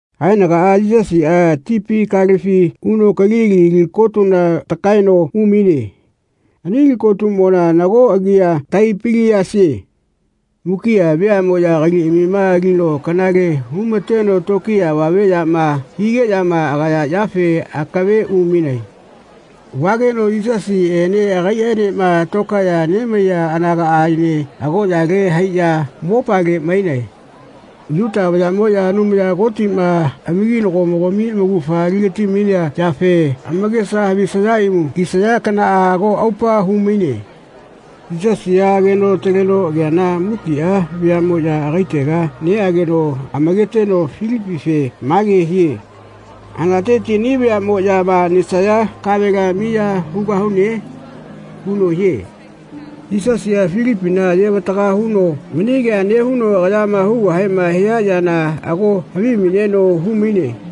Haenagaꞌa Yisasiꞌa tipi kalefi uno Kalili li kotuna takaeno umaine. Ani li kotumona nago agia Taipiliasie. Mukiꞌa veaꞌmoꞌya kaliꞌamima alino kanale hu-ma-teno tokiya avame yama higeꞌyama agaya yafe akave umainae. Vageno Yisasiꞌene agaiꞌaenema tokaeꞌya nemaiya anagaꞌaene agoꞌyale haiꞌya mopale mainae. Yuta vayaꞌmoꞌya Anumaya Kotiꞌma amakinagomogami amaugafama ali-gati-mainea yafe amakesa havisaya imu kisaya kanaꞌa ago aupa hu-maine. Yisasiꞌa ageno ataleno ageana mukiꞌa veaꞌmoꞌya agaitega neꞌageno amaketeno Filipife mage hie “Hanateti ani veaꞌmoꞌyama nesaya kavela miya hugahune?” huno hie. Yisasiꞌa Filipina ayevataga huno mani kea nehuno agayama hugahema hia yana ago havimaineno hu-maine.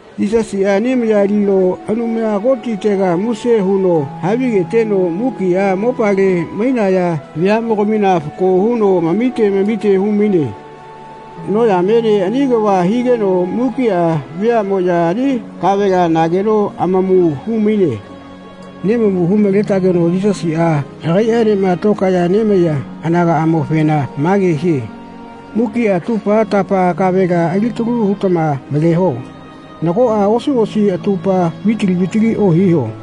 Yisasiꞌa ani maya alino Anumaya Kotitega muse huno havigeteno mukiꞌa mopale mainaya veaꞌmogamina fako huno amamite amamite hu-maine. Noyamene ani kava higeno mukiꞌa veaꞌmoꞌya ani kavela nageno amamu hu-maine. Nemamu hu-male-tageno Yisasiꞌa agaiꞌaenema tokaeꞌya nemaiya anagaꞌamofena mage hie “Mukiꞌa atupa-tapa kavela alitalu hu-tama maleho. Nagoꞌa osi osi atupa vitali vitali ohiho.”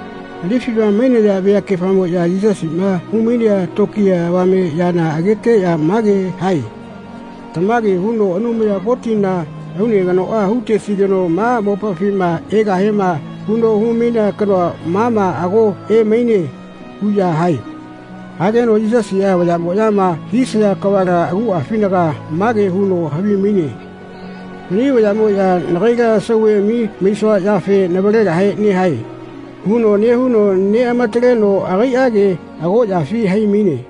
Anifiꞌma mainaya veakefamoꞌya Yisasiꞌma hu-mainea tokiya avame yana ageteꞌya mage hae “Tamage huno Anumaya Kotina aune kanoꞌa hu-tesigeno ma mopafima egahiema huno hu-mainea kanoa mama ago emaine.” huꞌya hae. Hageno Yisasiꞌa vayaꞌmoꞌyama hisaya kavala aguꞌafinaga mage huno havimaine “Mani vayaꞌmoya nagaila sauveꞌami maisua yafe navalegahe nehae.” huno nehuno neꞌamataleno agaiꞌage agoꞌyafi hai-maine.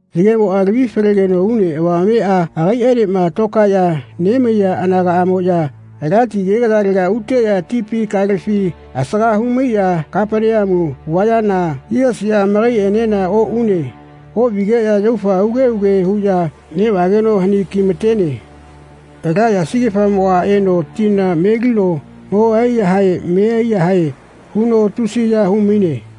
Yagemoꞌa lavi-falegeno une avamemaꞌa agaiꞌaenema tokaeꞌya nemaiya anagaꞌamoꞌya ala ti agegayalega uteꞌya tipi kalefi asaga hu-maiꞌya Kapaneamu vayana Yisasiꞌa amakaiꞌenena oꞌune. Oꞌvigeꞌya yaufa uge uge huꞌya neꞌvageno hani ki-ma-tene. Ala yasigefamoꞌa eno tina melino mo ai-yahae me ai-yahae huno tusiya hu-maine.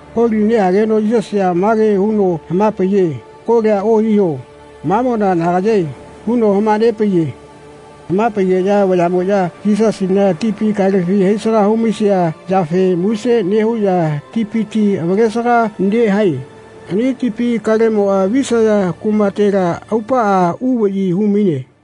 Koli nehageno Yisasiꞌa mage huno hama-paiye “Kolia ohiho mamona nagayae.” huno hama-nepaiye. Hama-paigeꞌya vayaꞌmoꞌya Yisasina tipi kalefi haisaga hu-maisia yafe muse nehuꞌya tipiti avalesaga nehae. Ani tipi kalemoꞌa visaya kumatela aupaꞌa uvaꞌyi hu-maine.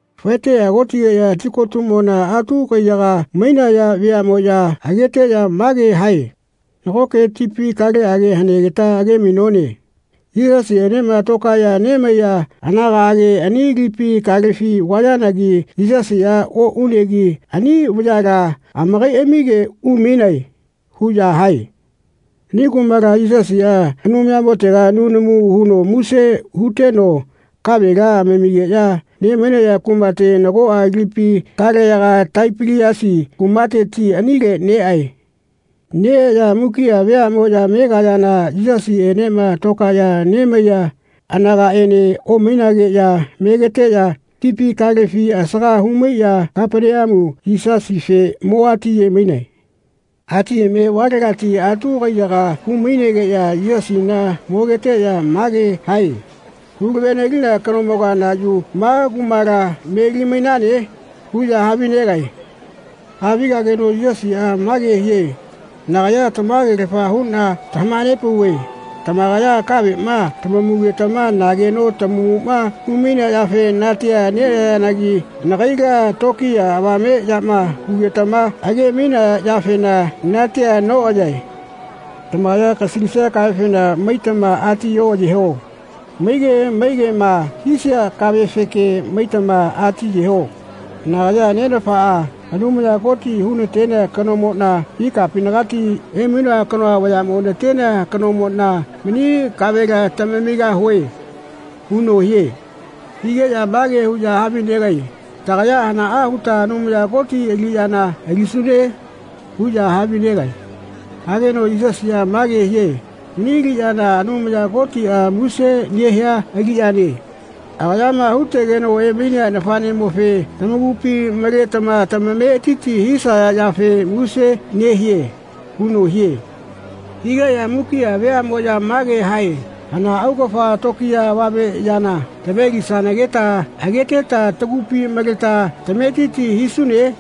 Faeteꞌya kotigeꞌya tikotuꞌmona atu kaiyaga mainaya veaꞌmoꞌya ageteꞌya mage hae “Nagoke tipi kaleꞌage hanegeta age-mainone. Yisasiꞌenema tokaeꞌya nemaiya anagaꞌage ani lipi kalefi vayanagi Yisasiꞌa oꞌunegi ani vayala amakaiꞌamige umainae.” huꞌya hae. Ani kumala Yisasiꞌa Anumayamotega nunamu huno muse huteno kavela amamigeꞌya ne-mainaya kumate nagoꞌa lipi kaleyaga Taipiliasi kumateti anile neꞌae. Neꞌeꞌya mukiꞌa veaꞌmoꞌya megayana Yisasiꞌenema tokaeꞌya nemaiya anagaꞌene omainageꞌya megeteꞌya tipi kalefi asaga hu-maiꞌya Kapaneamu Yisasife mo atiye-mainae. Atiyeme valegati atu kaiyaga umaineꞌya Yisasina mogeteꞌya mage hae “Hulave-nelina kanomoga na yu ma kumala meli-mainane?” huꞌya havinegae. Havigageno Yisasiꞌa mage hie “Nagaya tamagelafa huꞌna tamaha-nepauve tamakaya kaveꞌma tamamugetama nageno tamamuꞌma hu-mainea yafe natia neꞌayayanagi nagaila tokiya avame yama hugetama age-mainaya yafena natia noꞌayae. Tamakaya kasalisia kavefena maitama ati oꞌayeho. Maige maigema hisaya kavefeꞌke maitama atiyeho. Nagaya Nenafaꞌa, Anumaya Koti hu-na-tenea kanomoꞌna ikapinagati emainoa kanoa vayaꞌmo natenea kanomoꞌna mani kavela tamamigahue.” huno hie. Higeꞌya mage huꞌya havinegae “Tagaya hanaꞌa huta Anumaya Koti aliꞌyana alisune?” huꞌya havinegae. Hageno Yisasiꞌa mage hie “Mani aliꞌyana Anumaya Kotiꞌa muse nehia aliꞌyane. Agayama hu-tegeno emainea nafaꞌnemofe tamakupi maletama tamametiti hisaya yafe muse nehie.” huno hie. Higeꞌya mukiꞌa veaꞌmoꞌya mage hae “Hana augafa tokiya avame yana tave-lisanageta ageteta tagupina maleta tametiti hisune?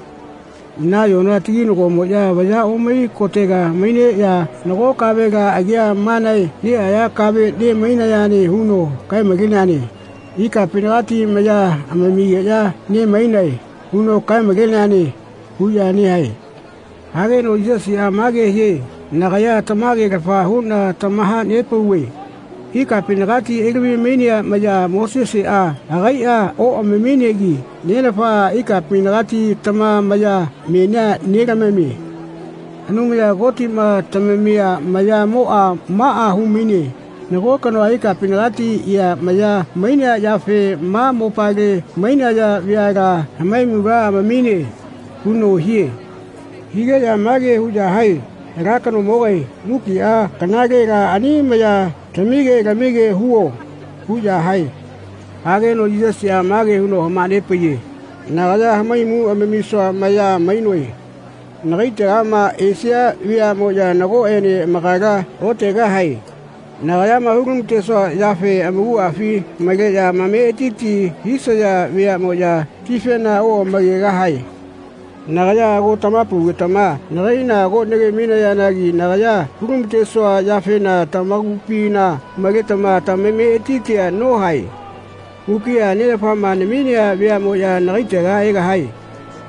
Nayona taginagomoꞌya vaya omai kotega maineꞌya nago kavela agia manae nehaya kave ne-mainayane huno kae-maleneane ‘Ikapinagati maya amamigeꞌya ne-mainae.’ huno kaemaleneane.” huꞌya nehae. Hageno Yisasiꞌa mage hie “Nagaya tamage-lafa huꞌna tamaha-nepauve ikapinagati elavi-mainea maya Moseseꞌa agaiꞌa oꞌamaminegi Nenafaꞌa ikapinagati tama maya menia nelamamie. Anumaya Kotiꞌma tamamia mayamoꞌa maꞌa hu-maine nago kanoa ikapinagati ea maya mainea yafe ma mopale mainaya veala hamaimula amamine.” huno hie. Higeꞌya mage huꞌya hae “Ala kanomogae mukiꞌa kanalela ani maya tamige lamige huo.” huꞌya hae. Hageno Yisasiꞌa mage huno hama-nepaiye “Nagaya hamaimu amamisua maya mainoe. Nagaitegama esia veaꞌmoꞌya nagoꞌene amakala otegahae. Nagayama hu-lama-tesua yafe amakuꞌafi maleꞌya amametiti hisaya veaꞌmoꞌya tifena oꞌamakegahae. Nagaya ago tamaha-paugetama nagaila ago nagemainayanagi nagaya hu-lama-tesua yafena tamakupina maletama tamametitia nohae. Mukiꞌa Nenafaꞌma naminea veaꞌmoꞌya nagaitega egahae.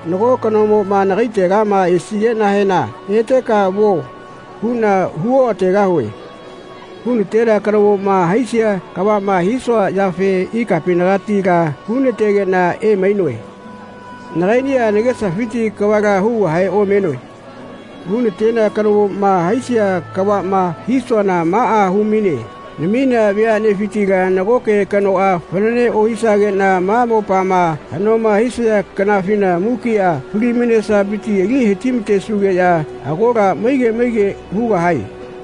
Nago kanomoꞌma nagaitegama esigeꞌnahena ‘Eteka vuo.’ huꞌna hu oꞌategahue. Hu-na-tenea kanomoꞌma haisia kavaꞌma hisua yafe ikapinagatila hu-nategeꞌna emainoe. Nagaiꞌniꞌa nagesafiti kavala hugahe omenoe. Hu-na-tenea kanomoꞌma haisia kavaꞌma hisuana maꞌa hu-maine naminea veaꞌnefitila nagoke kanoꞌa fanane ohisageꞌna ma mopama haꞌnoma hisia kanafina mukiꞌa fali-mainesafiti ali he-ti-matesugeꞌya agola maige maige hugahae.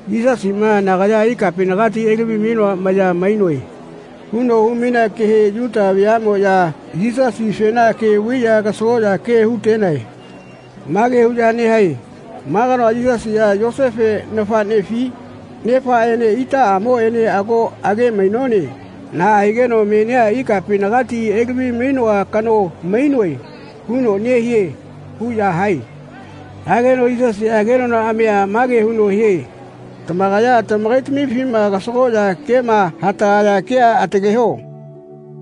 Yisasiꞌma “Nagaya ikapinagati elavi-mainoa maya mainoe.” huno hu-mainea kehe Yuta veaꞌmoꞌya Yisasifena ke vaiꞌya kasagoꞌya ke hu-tenae. Mage huꞌya nehae “Ma kanoa Yisasiꞌa, Yosefe nafaꞌnefi? Nefaꞌene itaꞌamoene ago age-mainone. Naꞌa higeno menia ‘Ikapinagati elavi-mainoa kano mainoe.’ huno nehie.” huꞌya hae. Hageno Yisasiꞌa kenonaꞌamia mage huno hie “Tamakaya tamakaitamifima kasagoꞌya kema hatagaya kea ataleho.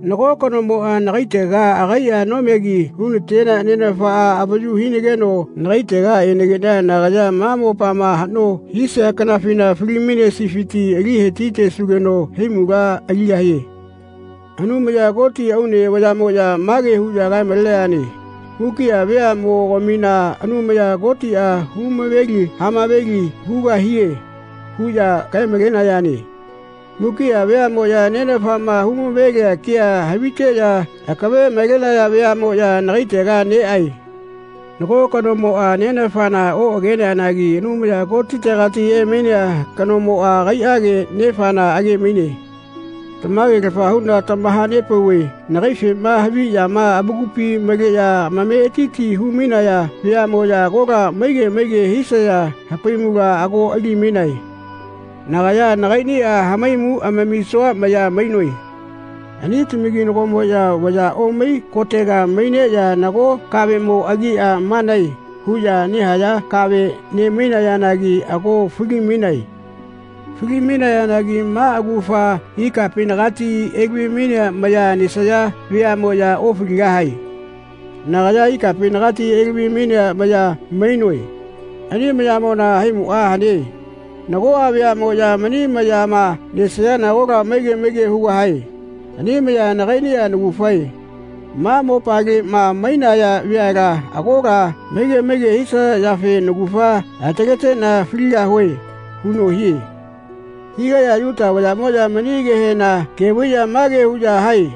Nago kanomoꞌa nagaitega agaiꞌa nomegi hu-na-tenea Nenafa avayu hinageno nagaitega enageꞌna nagaya ma mopama haꞌno hisia kanafina fali-mainesifiti ali he-ti-tesugeno haimula aligahie. Anumaya Koti aune vayaꞌmoꞌya mage huꞌya kae-malenayane Mukiꞌa veaꞌmogamina Anumaya Kotiꞌa hu-maveli hamaveli hugahie huꞌya kae-malenayane. Mukiꞌa veaꞌmoꞌya Nenafaꞌma hu-mavelia kea haviteꞌya akave malenaya veaꞌmoꞌya nagaitega neꞌae. Nago kanomoꞌa Nenafana oꞌageneanagi Anumaya Kotitegati emainea kanomoꞌa agaiꞌage Nefana age-maine. Tamage-lafa huꞌna tamaha-nepauve nagaifema haviꞌya amakupi maleꞌya amametiti hu-mainaya veaꞌmoꞌya agola maige maige hisaya hamaimula ago ali-mainae. Nagaya nagaiꞌniꞌa hamaimu amamisua maya mainoe. Ani tamakinagomoꞌya vaya omai kotega maineꞌya nago kaveꞌmo agia manae huꞌya nahaya kave ne-mainayanagi ago fali-mainae. Fali-mainayanagi maꞌa augafa ikapinagati elavia maya nesaya veaꞌmoꞌya ofaligahae. Nagaya Ikapinagati elavi-mainea maya mainoe. Ani mayamona haimuꞌa hane. Nagoꞌa veaꞌmoꞌya mani mayama nesayana agola maige maige hugahae. Ani maya nagaiꞌniꞌa naugafae. Ma mopaleꞌma mainaya veala agola maige maige hisaya yafe naugafa ataleteꞌna faligahue.” huno hie. Higeꞌya Yuta vayaꞌmoya mani kehena ke vaiꞌya mage huꞌya hae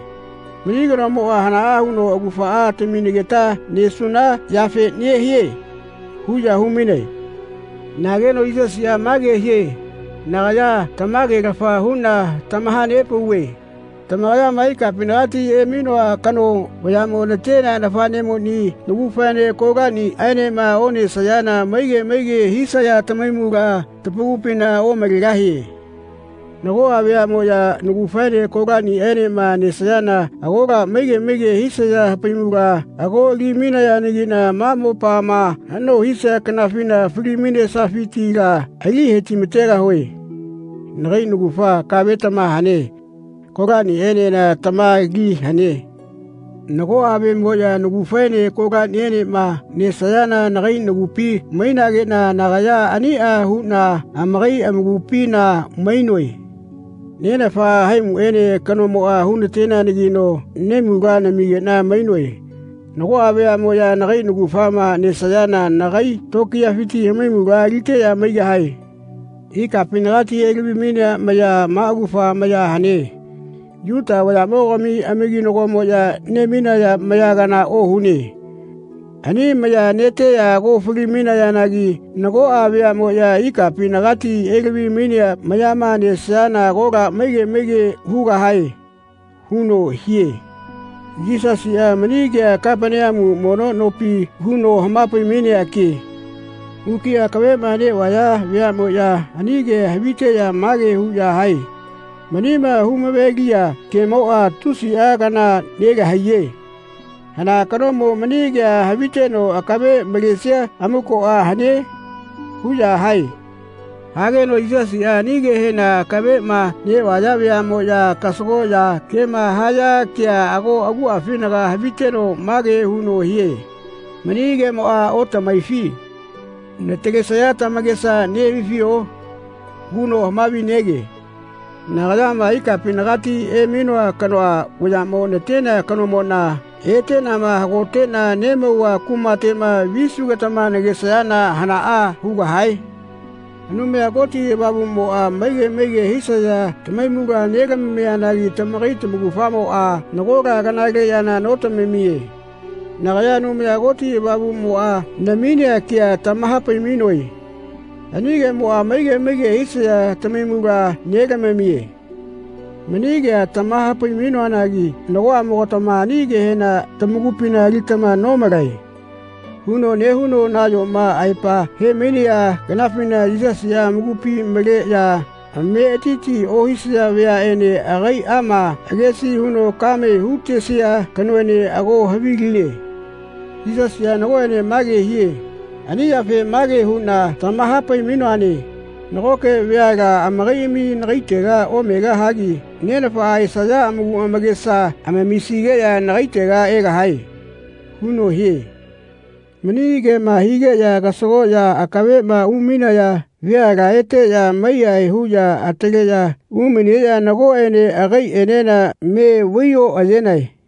“Mani kanomoꞌa hanaꞌa huno augafaꞌa taminegeta nesuna yafe nehie?” huꞌya hu-mainae. Nageno Yisasiꞌa mage hie “Nagaya tamage-lafa huꞌna tamaha-nepauve tamakayama ikapinagati emainoa kano vayaꞌmo na-tenea nafaꞌnemoni naugafaene kolaniꞌaenema onesayana maige maige hisaya tamahaimula tamakupina omalegahie. Nagoꞌa veaꞌmoꞌya naugafaene kolaniꞌaenema nesayana agola maige maige hisaya hamaimula ago ali-mainayanagiꞌna ma mopama haꞌno hisia kanafina fali-mainesafitila ali he-ti-ma-tegahue. Nagai naugafa, kave tama hane. Kolaniꞌaenena tama li hane. Nagoꞌa veaꞌmoꞌya naugafaene kolaniꞌaenema nesayana nagai nagupi mainageꞌna nagaya aniꞌa huꞌna amakai amakupina mainoe. Nenafaꞌa haimuꞌaene kanomoꞌa hu-nateneanagino nahaimula namigeꞌna mainoe. Nagoꞌa veaꞌmoꞌya nagai naugafama nesayana nagai tokiyafiti hamaimula aliteꞌya maigahae. Ikapinagati elavi-mainea maya maꞌa augafa maya hane. Yuta vayaꞌmogami amakinagomoꞌya ne-mainaya maya kana ohune. Ani maya neteꞌya ago fali-mainayanagi nagoꞌa veaꞌmoꞌya ikapinagati elavi-mainea mayama nesayana agola maige maige hugahae.” huno hie. Yisasiꞌa mani kea Kapaneamu mono nopi huno hama-pai-mainea ke. Mukiꞌa akaveꞌma neꞌvaya veaꞌmoꞌya ani kea haviteꞌya mage huꞌya hae “Manima hu-mave-lia kemoꞌa tusiꞌa kana nelahaiye. Hana kanomo mani kea haviteno akave malesia amukoꞌa hane?” huꞌya hae. Hageno Yisasiꞌa ani kehena akaveꞌma neꞌvaya veaꞌmoꞌya kasagoꞌya kema haya kea ago aguꞌafinaga haviteno mage huno hie “Mani kemoꞌa otamahaifi? Natalesaya tamakesa nehavifio?” huno hamavi-nege. Nagayama, ikapinagati emainoa kanoa vayaꞌmo natenea kanomoꞌna, eteꞌnama hagoteꞌna nemauva kumateꞌma visugetama nagesayana hanaꞌa hugahae? Anumaya Koti Avamuꞌmoꞌa maige maige hisaya tamahaimula nelamianagi tamakai tamaugafamoꞌa nagola kanale yana notamamie. Nagaya Anumaya Koti Avamuꞌmoꞌa naminea ke tamaha-pai-mainoe. Ani kemoꞌa maige maige hisaya tamahaimula nelamamie. Mani kea tamaha-pai-mainoanagi “Nagoꞌamogatama ani kehena tamakupina alitama nomalae.” huno nehuno nayoma aepa he-mainea kanafina Yisasiꞌa amakupi maleꞌya amametiti ohisaya veaꞌene agaiꞌama agesi huno kame ya hu-tesia kanoene ago haviline. Yisasiꞌa nagoꞌene mage hie “Ani yafe mage huꞌna tamaha-pai-mainoane nagoke veala amakaiꞌamia nagaitega omegahagi Nenafa esaya amaku amakesa amamisigeꞌya nagaitega egahae.” huno hie. Mani kema higeꞌya kasagoꞌya akaveꞌma umainaya veala eteꞌya mai-yahae huꞌya ataleꞌya umaineꞌya nagoꞌene agaiꞌenena me vai-oꞌayenae.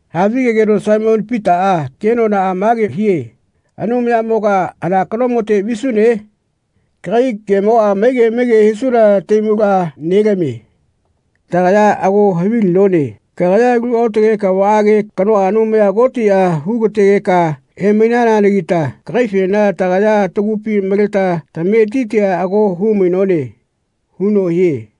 Hamavi-gegeno Saimoni Pitaꞌa kenonaꞌa mage hie “Anumayamoga hana kanomote visune? Kagai kemoꞌa maige maige hisuna tahaimula nelamie. Tagaya ago havilinone kagaya alu aotage kavaꞌage kanoa Anumaya Kotiꞌa hu-gategeka emainananagita kagaifena tagaya tagupi maleta tametitia ago hu-mainone.” huno hie.